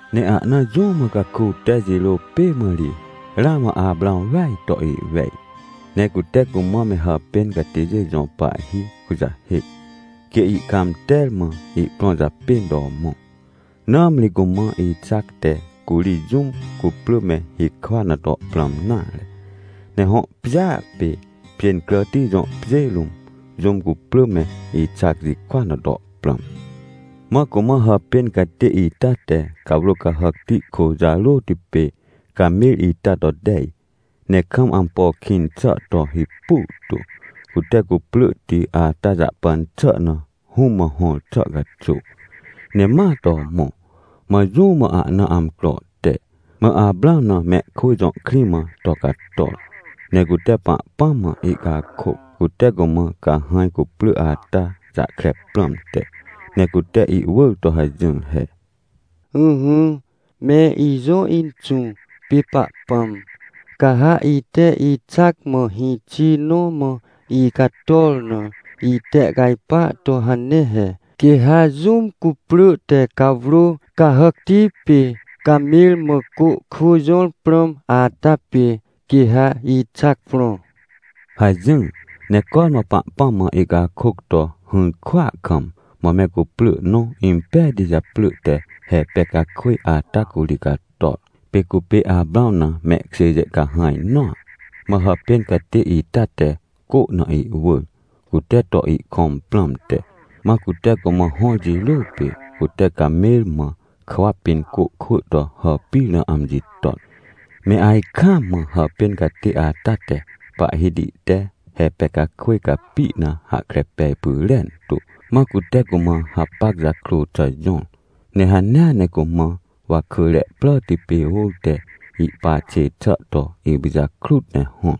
Ne ahna jũ mã caku te jirô pê mã ri ramã Aprãw weaj to ihwej, ne cute cumã me hàpên catêjê jõ pahhi kujahêc, quê ihcãmter mã ihprõ japên to mõ. Nãmri cumã Ixac te curi jũm cuprỳ me hikwa na to prãm nare, ne hõ pjêa pê Pjêncràti jõ pjê rũm, jũm cuprỳ me Ixac jikwa na to prãm. Mã cumã hàpên catê ita te cawrô cahàcti kô jarôti pê camer ita to tej, ne kam ampo kĩn xà to hipu tu, cute cuprỳhti ata jahpan xà na hũm mã hõr xà caxuw, ne ma to mõ. Mã jũ mã ahna amcro te, mã Aprãw na mehkwỳ jõ krĩ mã to cator. Ne cute Pahpãm mã ihcakôc, cute cumã cahãj cuprỳ ata jahkre prãmte. Ne cute ihwỳr to hajỹr he: — Ỹhỹ, me ijõ Inxũ pê Pahpãm. Ca ha ite Ixac mã hĩxi nõ mã icator na itehcajpa to hane he. Quê ha jũm cuprỳ te cawrô cahàcti pê camer mã cô kwỳ jõr prãm ata pê, quê ha Ixac prõ — hajỹr. Ne cormã Pahpãm mã ihcakôc to hỹr kwỳa kam, mã me cuprỳ nõ impejti japrỳ te Repecakwỳj ata curi cator. Pê cupê Aprãw na mehkjêjê cahãj nõa. Mã hàpên catê ita te cô na ihwỳr, cute to ihkõm prãmte. Mã cute cumã hõr jirô pê cute camer mã kwa pĩn cô kwỳ to hàpir na amji ton. Me ajkaam mã hàpên catê ata te, Pahhiti te Repecakwỳj capi na hahkre pej pyrentu. Mã cute cumã hapac jakrô xà jõr, ne hanea ne cumã wakỳre pràti pê ôr te ihpa xê xà to ipijakrut ne hõr.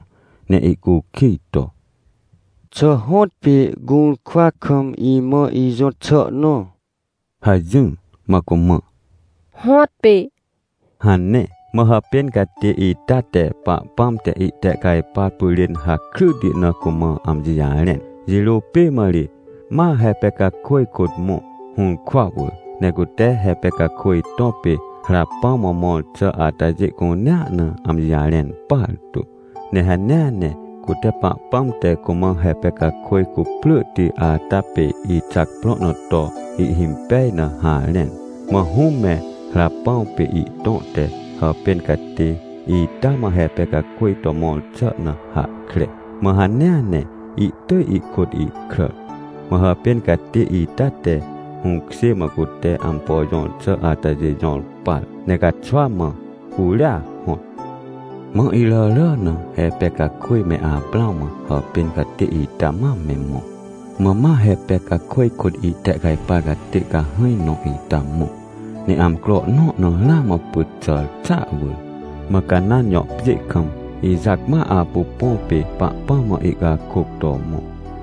Ne ihcukij to: — Xà hõtpê gũrkwa kam imã ijõt xà nõ — hajỹr. Mã cumã: — Hõtpê — hane. Mã hàpên catê ita te Pahpãm te ihtehcajpar pyrên hakryti na cumã amji jarẽn. Jirô pê mã ri, ma Repecakwỳj kôt mõ, hũrkwa wỳr. Ne cute Repecakwỳj tõ pê Rapãw mã mõr xà atajê cunea na amji jarẽn partu. Ne hanea ne cute Pahpãm te cumã Repecakwỳj cuprỳhti ata pê Ixac prõ na to ihhimpej na harẽn. Mã hũm me Rapãw pê ihtõ te hàpên catê ita mã Repecakwỳj to mõr xà na hahkre. Mã hanea ne ihtỳj ihkôt ihkràr. Mã hàpên catê ita te hũkjê mã cute ampo jõr xà atajê jõr par, ne caxwa mã curia hõt. Mã iràrà na Repecakwỳj me Aprãw mã hàpên catê ita ma me mõ. Mã ma Repecakwỳj kôt ihtehcajpar catê cahãj nõ ita mõ. Ne amcro nõ na ramã pyt xàr xàa wỳr, mã Canãn jõ pjê kam Ixac ma apu põ pê, Pahpãm mã ihcakôc to mõ.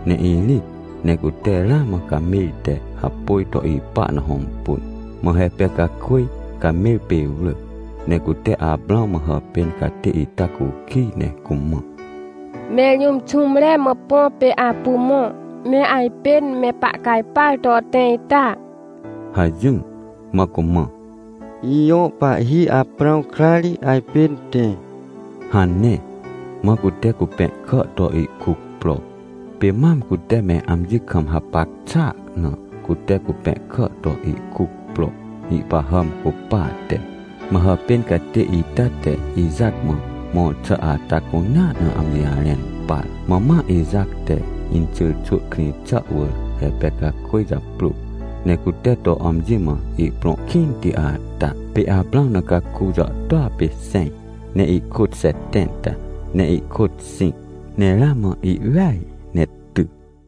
Ne irĩt ne cute ramã camer te hapôj to ipa na hõmpun. Mã Repecakwỳj camer pê wrỳc, ne cute Aprãw mã hàpên catê ita cukij ne cumã: — Mẽr jũm xũmre mã põ pê apu mõ, ne ajpên me pahcajpar to tẽ ita? — hajỹr. Mã cumã: — Ijõ pahhi Aprãw kra ri ajpên tẽ — hane. Mã cute cupẽhkà to ihkuc pro. Pê mam cute me amji kam hapac xàa na cute cupẽhkà to ihkuc pro, ihpahàm cupate. Mã hàpên catê ita te Ixac mã mõr xà ata cunea na amji jarẽn par. Mã ma Ixac te inxyrxwỳ krĩ xà wỳr Repecakwỳj japrôr, ne cute to amji mã ihprõ kĩnti ata. Pê Aprãw na caku jàhtôa pê xẽj ne ihkôt xetẽnta ne ihkôt xĩc ne ramã ihweaj ne ty.